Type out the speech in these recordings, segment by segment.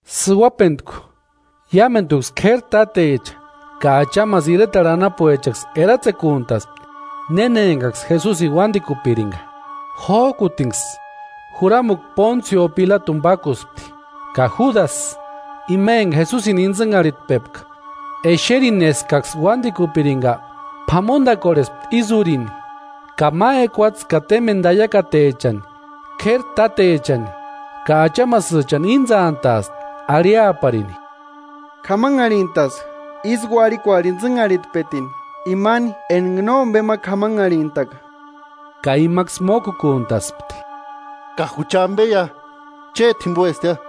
Sïuajpentku, iámenduksï k'éri tátecha ka achamasï iretarhu anapuechaksï eratsekuntaspti néna engaksï Jesusini uándikupiringa. Jójkutinksï juramuti Pónsio Pilatuni pákuspti. Ka Júdasï, ima enga Jesusini intsïnharhitpepka, exerini eskaksï uándikupiringa, p'amondakorhespti ísï úrini ka ma ekuatse ka témbeni taiakatechani k'éri tátechani ka achamasïchani íntsantaaspti arhiaparini: “K'amanharhintaska ísï uarhikuarhu intsïnharhitpetini imani enga nómbe ma k'amanharhintaka.” Ka imaksï mókukuntaspti: “¡Ka jucha ambeia, chéti jimboestiia!”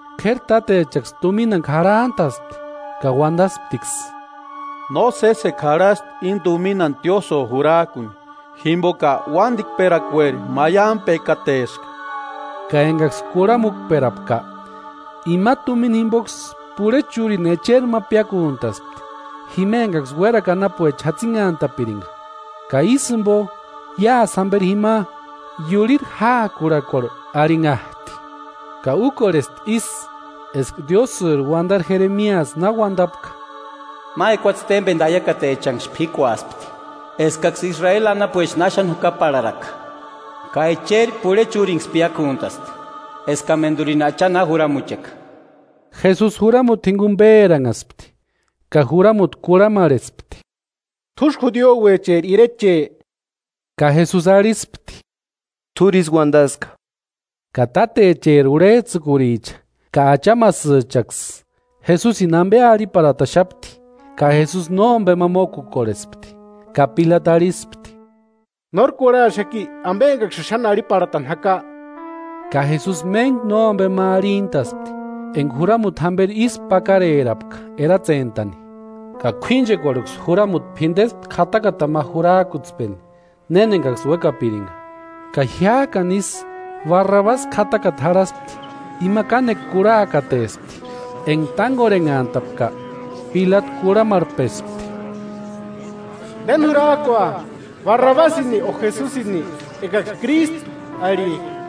K'éri tátechaksï tuminani k'arhantaspti ka uandasptiksï: “No sésekua jarhasti íni tuminani tiósïo jurajkuni, jimboka uándikperakueri maiampekateska.” Ka engaksï kurhamukperapka, imani tumina jimboksï purhechi úrini echeri ma piákuntaspti, jima engaksï uérakua anapuecha jatsinhantapiringa. Ka ísï jimbo iásï jamberi jima: “Iurhiri jáakurhakuarhu” arhinhajti. Ka úkorhesti ísï eska Diósïri uandari Jeremiasï na uandapka: “Ma ekuatse témbeni taiakatechanksï p'íkuaspti, eskaksï Israeli anapuecha náxani jukaparharaka, ka echeri, purhechi úrinksï piákuntasti, eskamendurini Acha na juramucheka.” Jesusi juramuti jinguni péranhaspti ka juramuti kurhamarhespti: “¿T'úsï judiuecheri ireche?” Ka Jesusi arhispti: “T'úri ísï uandaska”. Ka tátacheri urhejtsïkuricha ka achamasïchaksï, Jesusini ambe arhiparhataxapti, ka Jesusi nómbema mókukorhespti. Ka Pilatu arhispti: “¿Nóri kurhaxaki ambe engaksïni xáni arhiparhatani jaka?” Ka Jesusi méntku nómbe ma arhintaaspti, enga juramuti jamberi ísku pakarerapka eratsentani. Ka k'uínchekuarhu, juramuti p'indespti k'atakatani ma jurajkutspeni néni engaksï uékapiringa. Ka jiájkani ísï Barrabasi k'atakata jarhaspti, ima kánekua kurhakatespti. Enga tángorhenhantapka, Pilatu kurhamarhpespti: “¿Néni jurajkua, Barrabasini o Jesusini engaksï Krístu arhijka?”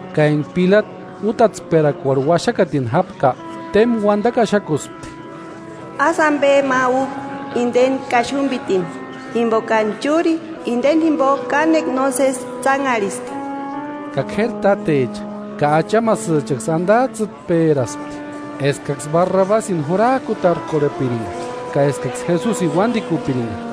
Ka enga Pilatu útatsperakuarhu uaxakatini jápka, témba uandakua axakuspti: “Ásï ambe ma úku inde kaxumbitini, jimbokani chúri indeni jimbo kánekua nósesi tsánharhiska.” Ka k'éri tátecha ka achamasïchaksï andajtsïtperaspti eskaksï Barrabasini jurajkutarkorhepiringa ka eskaksï Jesusini uándikupiringa.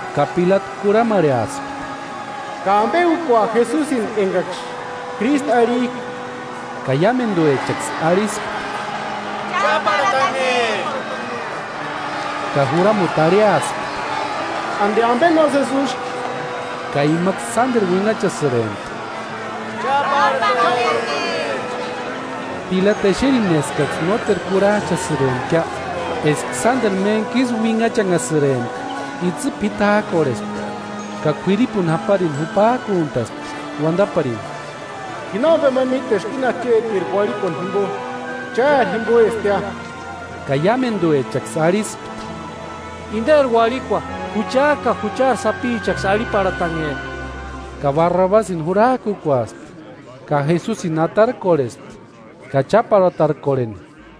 Ka Pilatu kurhamarheaspti: “¿Ka ambe úkua Jesusini engaksï Krístu arhijka?” Ka iámenduechaksï arhispti: “¡Cháparhatanhe!” Ka juramuti arhiaspti: “¿Andi ambe nósesi úski?” Ka imaksï sánderu uinhachasïrempti: “¡Cháparhatanhe!” Pilatu exerini eskaksï nóteru kurhajchasïrempkia, eska sánderu méntkisï uinhachanhasïrempka, itsï p'itajkorhespti ka k'uiripuni japarini jupajkuntaspti uandaparini: “Ji nómbe ma míteska íni achetiri uarhikuani jimbo, chári jimboestia.” Ka iámenduechaksï arhispti: “Inderi uarhikua jucha ka juchari sapichaksï arhiparhatanhe.” Ka Barrabasini jurajkukuaspti ka Jesusini atarkorhespti ka cháparhatarkorheni.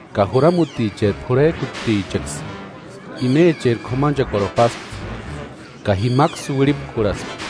Ka juramutiri p'urhejkutichaksï imecheri k'umanchekuarhu páspti, ka jimaksï uirhipkurhaspti.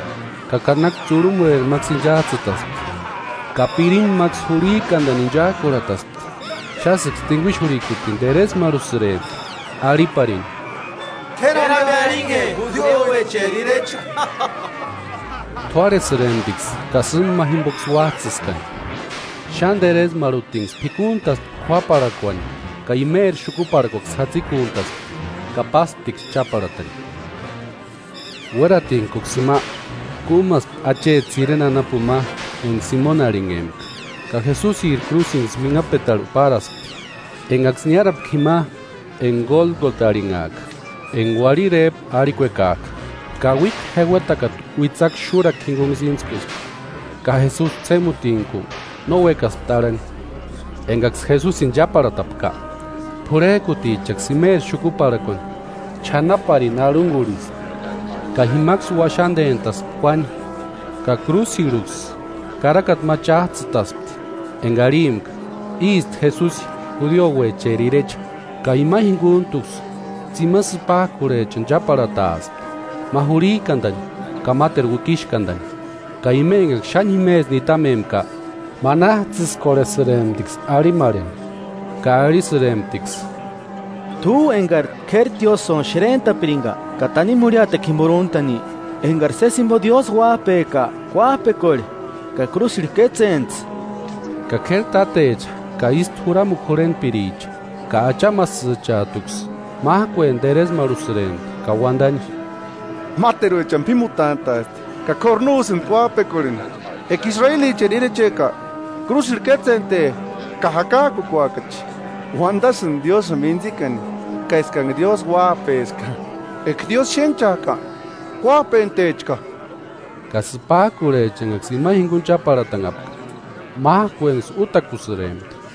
ka kanakua tsurhumueri máksï inchajtsïtaspti, ka pirimu máksï jurhijkandani inchajkurhataspti. Xásïksï tinguixurhikutini teresmarhusïrempti arhiparini: “¡K'éri ambe arhinhe judiuecheri irecha!” T'uárhesïremptiksï ka sîmba ma jimboksï uájtsïskani. Xáni teresmarhutinksï p'ikuntaspti k'uáparhakuani ka imeri xukuparhakuaksï jatsikuntaspti ka pásptiksï cháparhatani. Uératintkuksï jima, kúmaspti acheti Sireni anapuni ma enga Simoni arhinhempka; ka Jesusiri krúsinksï uinhapetarhu páraspti. Engaksï niárapka jima enga Gólgota arhinhajka (enga uarhiri éjpu arhikuekajka), Kauikua jeuetakata uitsakua xúrakua jingunksï íntskuspti, ka Jesusi ts'émutintku no uékaspti arhani. Engaksï Jesusini cháparhatapka, p'urhejkutichaksï imeri xukuparhakuani ch'anaparini arhungurhispti. Ka jimaksï uaxandentaspti kuáni. Ka krúsirhuksï karakata ma chájtsïtaspti enga arhimpka: “Ísti Jesusi, judiuecheri irecha.” Ka ima jinguntuksï tsimani sïpajkurhechani cháparhataaspti, ma jurhijkandani ka máteru uikixkandani. Ka ima engaksï xáni jimesï nitamempka manajtsïskorhesïremptiksï arhimarheni ka arhisïremptiksï: “T'u engari k'éri tiósïoni xerentapiringa ka tanimu jurhiatekua jimbori úntani, engari sési jimbo Diósï uájpeka kuájpekorhe, ka krúsirhu kétsentsï.” Ka k'éri tátecha ka ístu juramukua jurhentpiricha ka achamasïchajtuksï májkueni teresmarhusïrempti ka uandani: “Máteruechani p'ímutantaasti ka kóru no úsïndi kuájpekorheni. Eka Israelicheri irecheka, krúsirhu kétsente ka jakajkukuakachi. Uandasïndi Diósïni mintsikani ka eskanha Diósï Uájpeska, eka Diósï xénhchajka kuájpentechka.” Ka sïpajkurhecha engaksï ima jinguni cháparhatanhapka májkuenksï útakusïrempti.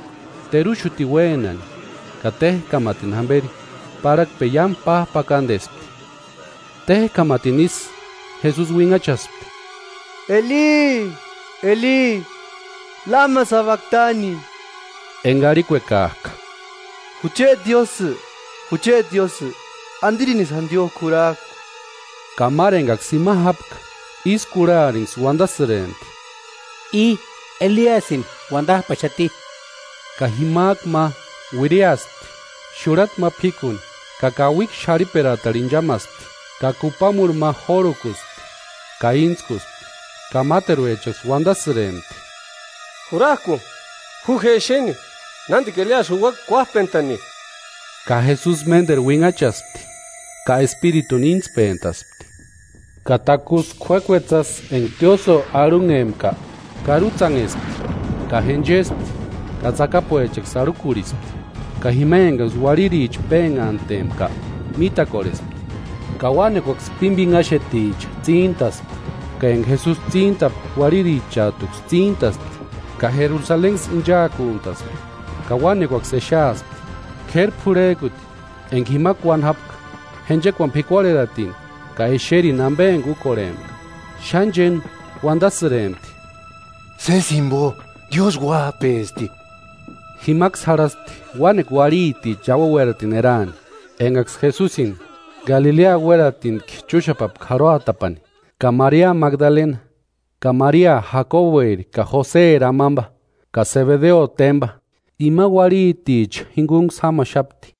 Teruxutini uénani ka téjkamatini jamberi parhakpeni iámu p'ajpakandespti. Téjkamatini ísï, Jesusi uinhachaspti: “Eli, Eli, ¿Lema sabaktani?” (Enga arhikuekajka: “Jucheti Diósï, jucheti Diósï ¿Andirinisï jandiojku jurajku?”). Ka máru engaksï jima jápka, ísï kurharinksï uandasïrempti: “I Eliasïni uandajpaxati.” Ka jimajku ma, uiriaspti xurhata ma p'íkuni ka kauikua xarhiperakatarhu inchamaspti, ka kupamurhu ma jórhukuspti ka íntskuspti. Ka máteruechaksï uandasïrempti: “Jurajku, ju je exeni nándika Eliasï juuaka kuájpentani.” Ka Jesusi ménderu uinhachaspti ka espirituni íntspentaspti. Ka takusï k'uék'uetsasï enga tiósïo arhunhempka karutsanhespti; ka jenchespti ka tsakapuechaksï arhakurhispti. Ka jima engaksï uarhiricha pénhantempka, mítakorhespti ka uánekuaksï pímbinhaxeticha tsíntaspti. Ka enga Jesusi tsíntapka uarhirichajtuksï tsíntaspti ka Jerusalenksï inchaakuntaspti ka uánekuaksï exeaspti. K'éri purhejkuti, enga jima kuáni jápka, jenchekuani p'ikuarheratini ka exerini ambe enga úkorhempka. Xáni chéni uandasïrempti: “¡Sési jimbo, Diósï Uájpespti!” Jimaksï jarhaspti uánekua uarhiticha iauani uératini eraani, engaksï Jesusini Galilea uératintki chúxapapka jarhuatapani. Ka Maria Magdalena ka Maria Jakobueri ka Joseri amamba ka Sebedeo témba, imani uarhiticha jingunksï jámaxapti.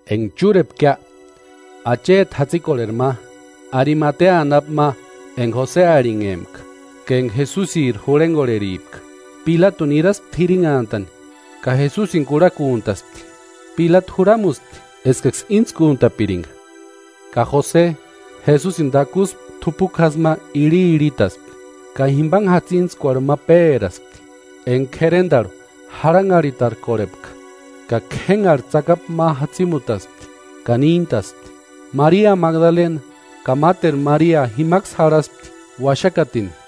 Enga churepkia, acheti jatsikorheri ma, Arimatea anapu ma enga Jose arhinhempka, ka enga Jesusiri jurhengorheripka. Pilatuni niraspti jirinhantani ka Jesusini kurhakuntaspti. Pilatu juramuspti eskaksï íntskuntapiringa. Ka Jose, Jesusini takusï t'upuki jásï ma irhirhitaspti, ka jimbanhe jatsintskuarhu ma péraspti, enga k'erendarhu jarhanharhitarkorhepka, ka k'énhari tsakapu ma jatsimutaspti ka níntaspti. Maria Magdalena ka máteru Maria jimaksï jarhaspti uaxakatini.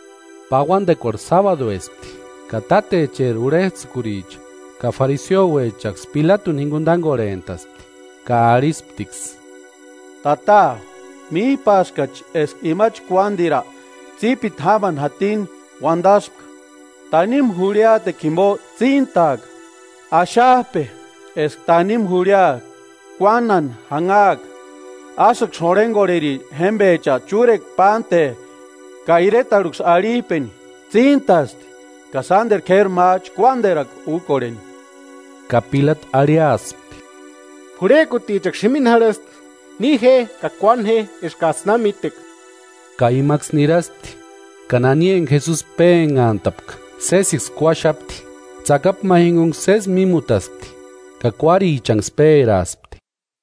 Pauandekuarhu sábaduespti, ka tátecheri urhejtsïkuricha ka fariseuechaksï Pilatuni jinguni tángorhentaspti ka arhisptiksï: “Tata, míjpaskachi eska ima chkuándira, tsípiti jámani jatini uandaspka: ‘Tanimu jurhiatekua jimbo tsíntaaka.’ Axajpe, eska tanimu jurhia kuánhani janhaaka, ásïksï jurhengorheri jémbecha chúrekua pánte ka iretarhuksï arhijpeni: Tsíntasti ka sánderu k'éri ma chkuándirakua úkorheni.” Ka Pilatu arhiaspti: “P'urhejkutichaksï jimini jarhasti, ni je ka kuáni je eskajtsï na míteka.” Ka imaksï niraspti ka nani enga Jesusi pénhantapka sésiksï kuáxapti, tsakapu ma jingunksï sési mímutaspti ka kuárichanksï péraaspti.